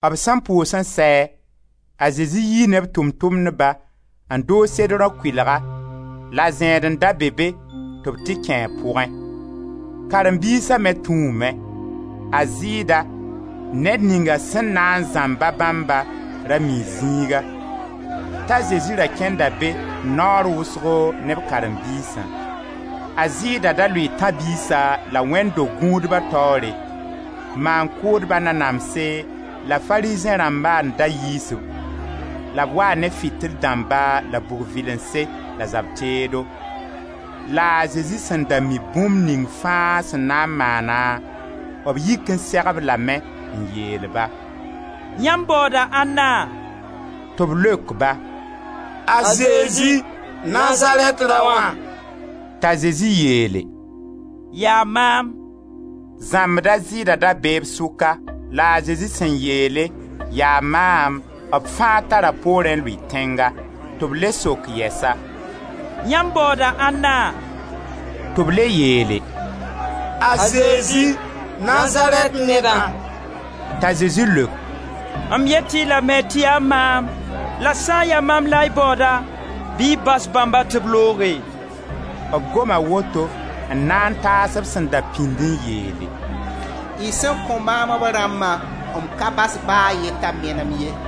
B sẽn pʋʋs n sɛ, a Zezi yii ne b Tʋʋm-tʋmdba, n dʋʋg Sedrõ kʋɩlga, la zẽed n da be be tɩ b tɩ kẽe a pʋgẽ. Karen-biisa me tũume. A Zɩɩda — ned ninga sẽn na n zãmba bãmba — ra mii zĩiga, t'a Zezi ra kẽnda be naoor wʋsgo ne b karen-biisã. A Zɩɩda da lʋɩɩ tãb-biisa la wẽnd do-gũudba taoore; maan-kʋʋdba nanamse la Farizẽ rãmba n da yiis-b; la b waa ne fitil dãmba la bug vɩlense, la zab teedo. La a Zezi sẽn da mi bũmb ning fãa sẽn na n maana, b yik n seg-b lame n yeel-ba: «Yãmb baooda ãnna?» Tɩ b leok-ba: «A Zezi, Nazarɛt raoã.» T'a Zezi yeele: «Yaa maam!» Zãmbd a Zɩɩda da bee b sʋka. La a Zezi sẽn yeele: «Yaa maam!» B fãa tara poorẽ n lʋɩ tẽnga. Tɩ b le sok yɛsa: «Y baooda ãnna?» Tɩ b le yeele: «A Zezi, Nazarɛt nedã!» T'a Zezi leok: «M yeel-y lame tɩ yaa maam; la sã n ya maam la y baooda, bɩ y bas bãmba tɩ b looge.» B goma woto n na n taas b sẽn da pĩnd n yeele: «Y sẽn kõ maam b rãmbã, m ka bas ba a ye t'a menem ye.»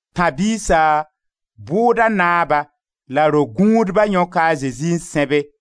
Tãb-biisa, bʋʋda naaba la ro-gũudba yõka a Zezi n sẽbe,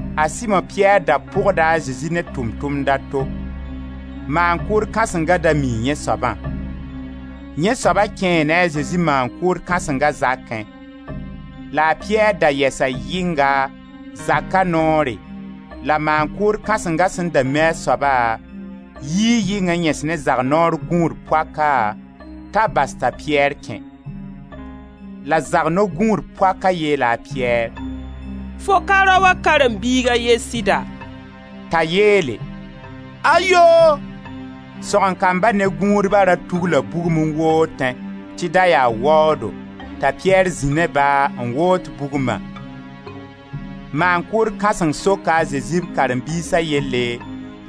A Simo-Piyɛr da pʋgda a Zezi ne tʋʋm-tʋmd a to. Maan-kʋʋd kãsengã da mii yẽ soabã. Yẽ soaba kẽe ne a Zezi maan-kʋʋd kãsenga zakẽ. La a Piyɛr da yɛsa yɩnga, zaka noore la maan-kʋʋd kãsenga sẽn da mi a soaba, yii yɩng n yẽs ne zak-noor-gũud poaka t'a bas t'a Piyɛr kẽ. La zak-noor-gũud poakã yeela a Piyɛr: «Fo ka raoã karen-biig a ye sɩda?» T'a yeele: «Ayoo!» Sõgen-kamba ne gũudba ra tugla bugum n wootẽ tɩ da yaa waoodo, t'a Piyɛr zĩ ne-ba, n woot bugma. Maan-kʋʋd kãseng soka a Zezi b karen-biisa yelle,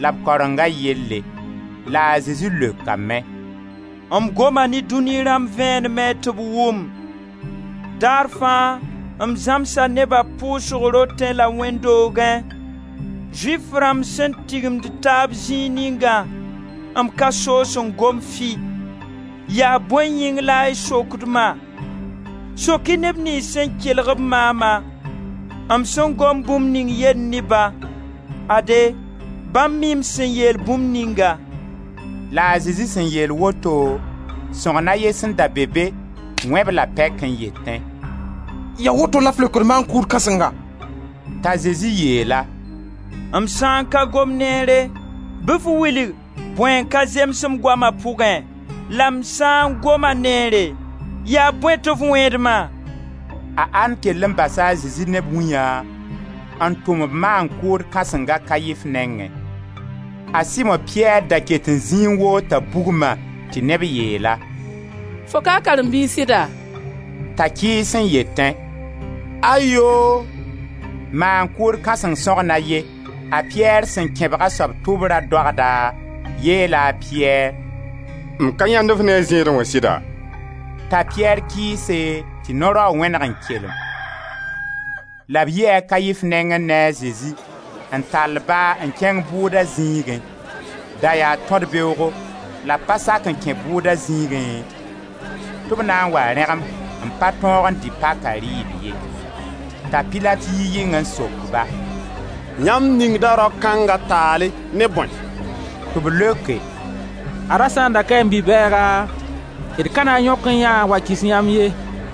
la b karenga yelle. La a Zezi leokame: «M goma ne dũni rãmb vẽenemẽ tɩ b wʋm, daar fãa m zãmsa nebã pʋsg rotẽ la wẽnd doogẽ, Zʋɩf rãmb sẽn tigimd taab zĩig ningã, m ka soos n gom fɩ. Yaa bõe yĩng la y sokd-ma? Sok-y neb niyns sẽn kelg-b maama, m sẽn gom bũmb ning yelle ne-ba. Ade, bãmb mii m sẽn yeel bũmb ninga.» La a Zezi sẽn yeel woto, sõgen a ye sẽn da be be wẽ-b la pɛk n yetẽ: «Yaa woto la f leokd maan-kʋʋd kãsenga?» T'a Zezi yeel-a: «M sã n pa gom neere, bɩ f wilg bõe n ka zems m goama pʋgẽ, la m sã n goma neere, yaa bõe tɩ f wẽed ma?» A An kell n basa Zezi ne b wĩyã n tʋm-b maan-kʋʋd kãsenga a Kaif nengẽ. A Simo-Piyɛr da ket n zĩi n woota bugma tɩ neb yeel-a: «Fo ka a karen-biig sɩda?» T'a kɩɩs n yetẽ: «Ayoo!» Maan-kʋʋd kãseng sõgen a ye, a Piyɛr sẽn kẽbg a soab tʋbra doagda, yeela a Piyɛr: «M ka yãend-f ne a zẽedẽ wã sɩda?» T'a Piyɛr kɩɩse, tɩ no-raoog wẽneg n kelem. La b yi a Kaif nengẽ ne a Zezi, n tall-ba n kẽng bʋʋda zĩigẽ; da yaa tõd-beoogo la b pa sak n kẽ bʋʋda zĩigẽ, tɩ b na n wa rẽgem n pa tõog n dɩ paka rɩɩb ye. T'a Pilat yi yɩng n sok-ba: «Yãmb ningda rao kãnga taale ne bõe?» Tɩ b leoke: «Ad-a sã n da kaẽ bi-bɛɛga, d ka na n yõkẽ yã n wa kɩs yãmb ye.»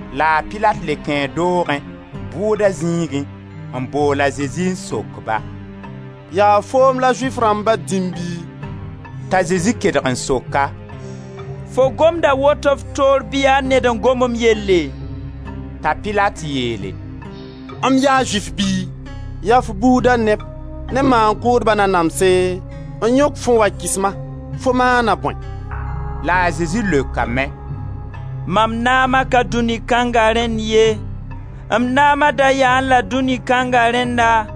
La a Pilat le kẽe doogẽ, bʋʋda zĩigẽ n bool a Zezi n sok-ba: «Yaa foom la Zʋɩf rãmba dĩm bɩ?» T'a Zezi kedg n sok-a: «Fo gomda woto f toor bɩ yaa ned n gom m yelle?» T'a Pilat yeele: «M yaa Zʋɩf bɩ? Yaa f buuda neb ne maan-kʋʋdb nanamse n yõk-f n wa kɩs-ma, fo maama bõe?» La a Zezi leokame: «Mam naama ka dũni kãnga rẽnn ye, m naama da yaẽ-la dũni kãnga rẽnna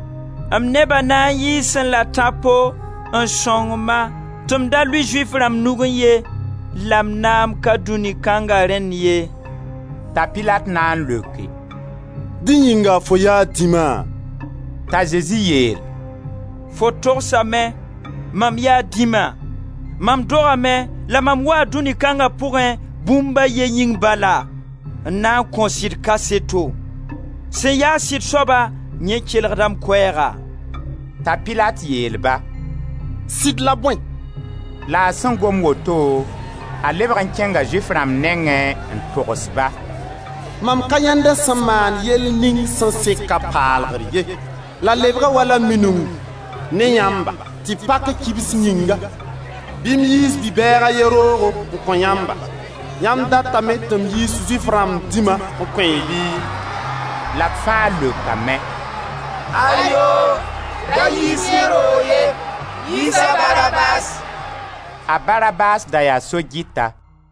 m neba na n yɩɩsẽ-la tãpo n sõng-ma tɩ m da lʋɩ Zʋɩf rãmb nugẽ ye, la m naam ka dũni kãnga rẽnn ye.» T'a Pilat na n leoke: «Dẽ yĩnga fo yaa dĩma?» T'a Zezi yeel: «Fo togsame, mam yaa dĩma, mam dogame, la mam waa dũni kãnga pʋgẽ bũmb a ye yĩng bala: n na n kõ sɩd kaseto. Sẽn ya-a sɩd soaba, yẽ kelgda m koɛɛga.» T'a Pilat yeel-ba: «Sɩd la bõe?» La a sẽn gom woto, a lebg n kẽnga Zʋɩf rãmb nengẽ n tosg-ba: «Mam ka yãend a sẽn maan yell ning sẽn sek a paalgr ye. La lebga wala minung ne yãmb tɩ pak kibs yĩnga bɩ m yiis bi-bɛɛg a ye roogo n kõ-yãmba, yãmb datame tɩ m yiis Zʋɩf rãmb dĩma n kõ-y bi?» La b fãa leokame: «Ayoo! Da yiis yẽ roog ye, yiis a Barabas.» A Barabas da yaa so-gɩta.